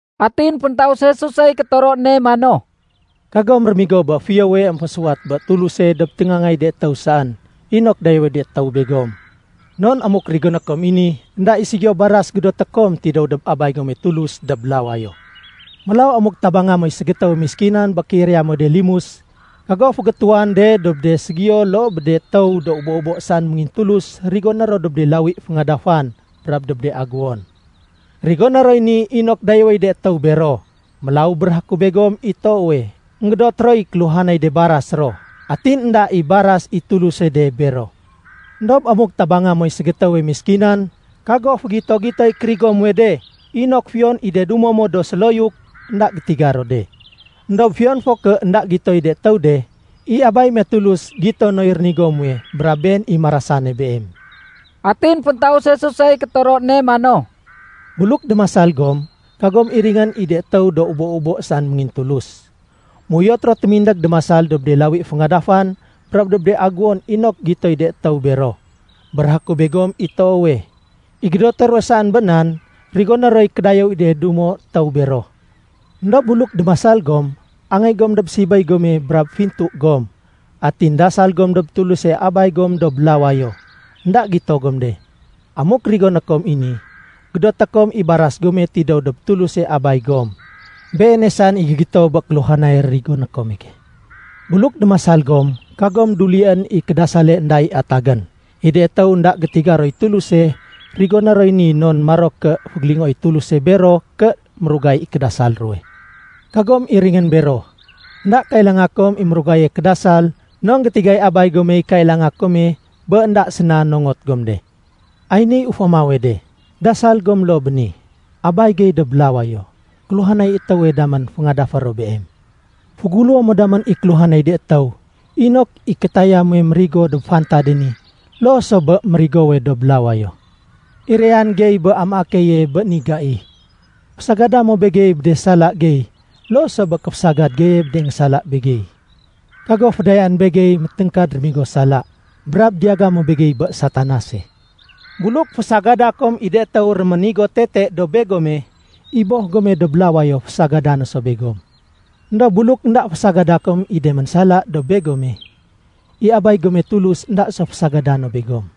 Atin féntaus Jesusey kétoro ne mano, “Kagom rémigo bé fiyowe émfésuwat bé Tuluse dob téngaangay de étéw saén inok dayéwéy de étéw begom. Non amuk rigoné kom i ni, énda i ségiyo baras gédoté kom tidéw dob Abay gome Tulus dob lawayo. “Mélaw amuk tabanga moy ségétéwe méskinan bé kéiraya muwe de limus, kago fégétuwan de dob de ségiyo loo bé de étéw do ubo-ubo saén méngintulus rigoné ro dob de lawi féngadafan brab dob de aguwon. Rigoné roy ni inok dayéwéy de étéw bero. Mélaw béréhé ku begom i toowe, énggédot roy kéluhanay de baras ro, atin énda i baras i Tuluse de bero. Endob amuk tabanga moy ségétéwe méskinan, kago fégito-gitoy kérigo muwe de inok fiyon i de dumo mo do séloyuk énda gétiga ro de. Endob fiyon fo ké énda gitoy de étéw de, i Abay me Tulus gito noy rénigo muwe brab Been i marasane beem.” Atin féntaus Jesusey kétoro ne mano, “Buluk démasal gom, kagom iringén i de étéw do ubo-ubo saén méngintulus. Méuyot ro témindég démasal dob de lawi féngadafan brab dob de aguwon inok gitoy de étéw bero. Béréhé ku begom i toowe, i gédoté ruwe saén bé nan rigoné roy kédayéw i de dumo étéw bero. Endob buluk démasal gom, angéy gom dob sibéy gome brab fintu gom, atin dasal gom dob Tuluse Abay gom dob lawayo énda gito gom de. Amuk rigoné kom i ni, gédoté kom i baras gome tidéw dob Tuluse Abay gom. Beene saén i gégitowe bé kéluhanay rigoné kome. “Buluk démasal gom, kagom dulién i kédasale énda i atagén. I de étéw énda gétiga roy Tuluse rigoné roy ni non maro ké fégélingoéy Tuluse bero ké mérugay i kédasal ruwe. Kagom iringén bero. Enda kailanga kom i mérugaye kédasal non gétigay Abay gomey kailanga kome bé énda séna nongot gom de. “Ay niy ufamawe de. Dasal gom loo bé ni, ‘Abay gey dob lawayo, kéluhanay étéwe damén féngadafé ro Beem. Féguléwo mo damén i kéluhanay de étéw inok i kétaya muwe mérigo dob fantade ni loo so bé mérigowe dob lawayo. Irayan gey bé amaé keye bé ni gai. Fésagada mo begey bé de sala gey loo so bé kéfésagad geye bé de énggésala begey. Kago fédayaén begey météngkad rémigo sala. Brab diyaga mo begey bé Satanase.’ “Buluk fésagada kom i de étéw réménigo tete dob begome, i Boh gome dob lawayo fésagada no so begom. Endob buluk énda fésagada kom i de ménsala dob begome, i Abay gome Tulus énda so fésagada no begom.”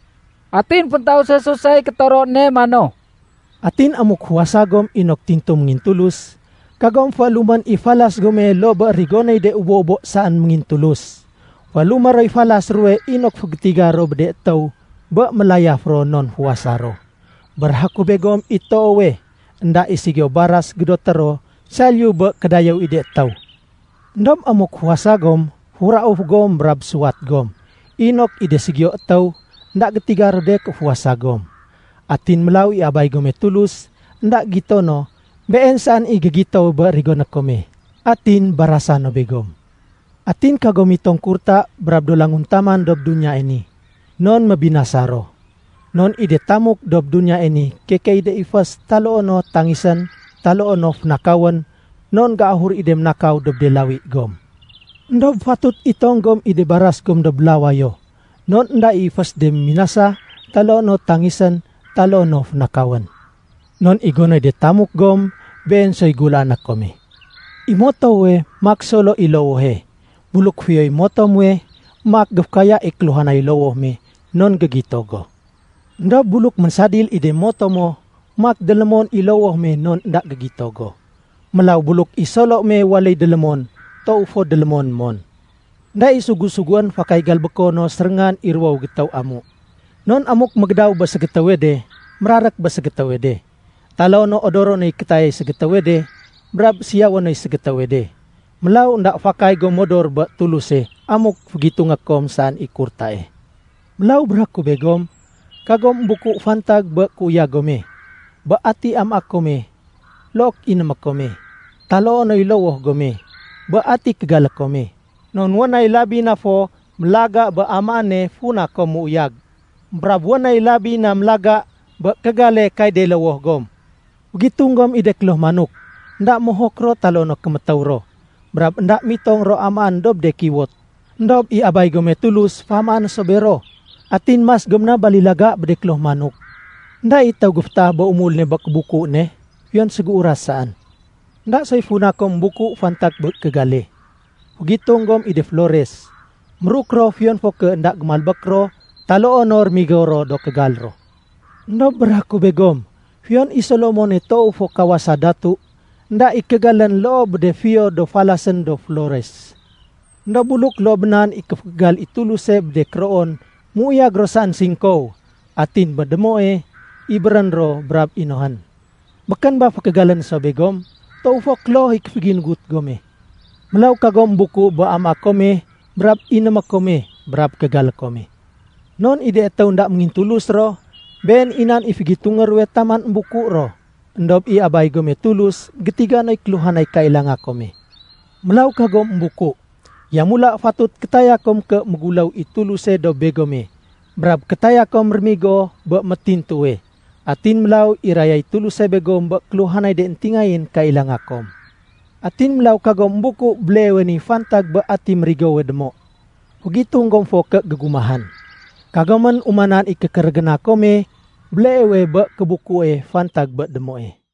Atin féntaus Jesusey kétoro ne mano, “Atin amuk fuwasa gom inok tintu méngintulus, kagom féélumén i falas gome loo bé rigonéy de ubo-ubo saén méngintulus. Féélumé roy falas ruwe inok fégétiga ro bé de étéw bé mélayaf ro non fuwasa ro. Béréhé ku begom i toowe, énda i ségiyo baras gédoté ro saliyu bé kédayéw i de étéw. Endob amuk fuwasa gom, furauf gom brab suwat gom, inok i de ségiyo étéw, énda gétiga ro de ké fuwasa gom. Atin mélaw i Abay gome Tulus énda gitono, Been saén i gégitowe bé rigoné kome, atin barasa no begom. “Atin kagom mitong kurta brab do languntaman dob duniyae ni, non mébinasa ro. Non i de tamuk dob duniyae ni keke i de ifés taloo no tangisén taloo no fénakawén non géahur i de ménakaw dob de lawi gom. Endob fatut itong gom i de baras gom dob lawayo non énda i ifés de méminasa taloo no tangisén taloo no fénakawén. Non i gonoy de tamuk gom, been soy gulaané kome. “I motowe maak solo i lowohe. Buluk fiyoy moto muwe, maak géfékaya i kéluhanay lowoh me non gégito go. Endob buluk ménsadil i de moto mo, maak délémon i lowoh me non énda gégito go. Mélaw buluk i solo me waléy délémon, toow fo délémon mon. “Enda i sugu-suguén fakay galbéko no séréngan i ruwowe gétéw amu. Non amuk mégédaw bé ségétéwe de, mérarék bé ségétéwe de. Taloo no odoro noy kétayay ségétéwe de, brab siyawé noy ségétéwe de. Mélaw énda fakay gom modor bé Tuluse amuk fégitungé kom saén i kurtae. “Mélaw béréhé ku begom, kagom émbuku fantag bé kéuyag gome, bé ati amaé kome look inémé kome, taloo noy lowoh gome, bé ati kégalé kome. Non wén nay labi na fo mélaga bé amaéne funa kom méuyag, brab wén nay labi na mélaga bé kégale kay de lowoh gom. Fégitung gom i de kloh manok. Enda mohok ro taloo no kémétéw ro, brab énda mitong ro amaén dob de kiwot. Endob i Abay gome Tulus féamaé no so bero. Atin mas gom na balilaga bé de kloh manok! Enda i étéw géfétaah bé umul ne bé kébuku ne, fiyon ségéuras saén. “Enda soy funa kom émbuku fantag bé kégale. Fégitung gom i de flores. Méruk ro fiyon fo ké énda gémalbék ro taloo no rémigo ro do kégal ro. Endob béréhé ku begom, fiyon i Solomone toow fo kawasa datu, énda i kégalén loo bé de fiyo do falasén do flores. Endob buluk loo bé nan i kéfékégal i Tuluse bé de kéroon méuyag ro saén singkow, atin bé démoe ibérén ro brab inohén, békén ba fékégalé no so begom? Toow fo kloh i kéféginugut gome. “Mélaw kagom émbuku bé amaé kome brab inémé kome brab kégalé kome. Non i de étéw énda méngintulus ro, been i nan i fégitungé ruwe taman émbuku ro. Endob i Abay gome Tulus gétiga noy kéluhanay kailanga kome. Mélaw kagom émbuku. Yamula fatut kétaya kom ké méguléw i Tuluse dob begome brab kétaya kom rémigo bé métintuwe, atin mélaw irayay Tuluse begom bé kéluhanay de éntingayén kailanga kom. Atin mélaw kagom émbuku béleewe ni fantag bé ati mérigowe démo, fégitung gom fo ké gégumahén. Kagomén umanan i kékérégéna kome béleewe bé kébukue fantag bé démoe.”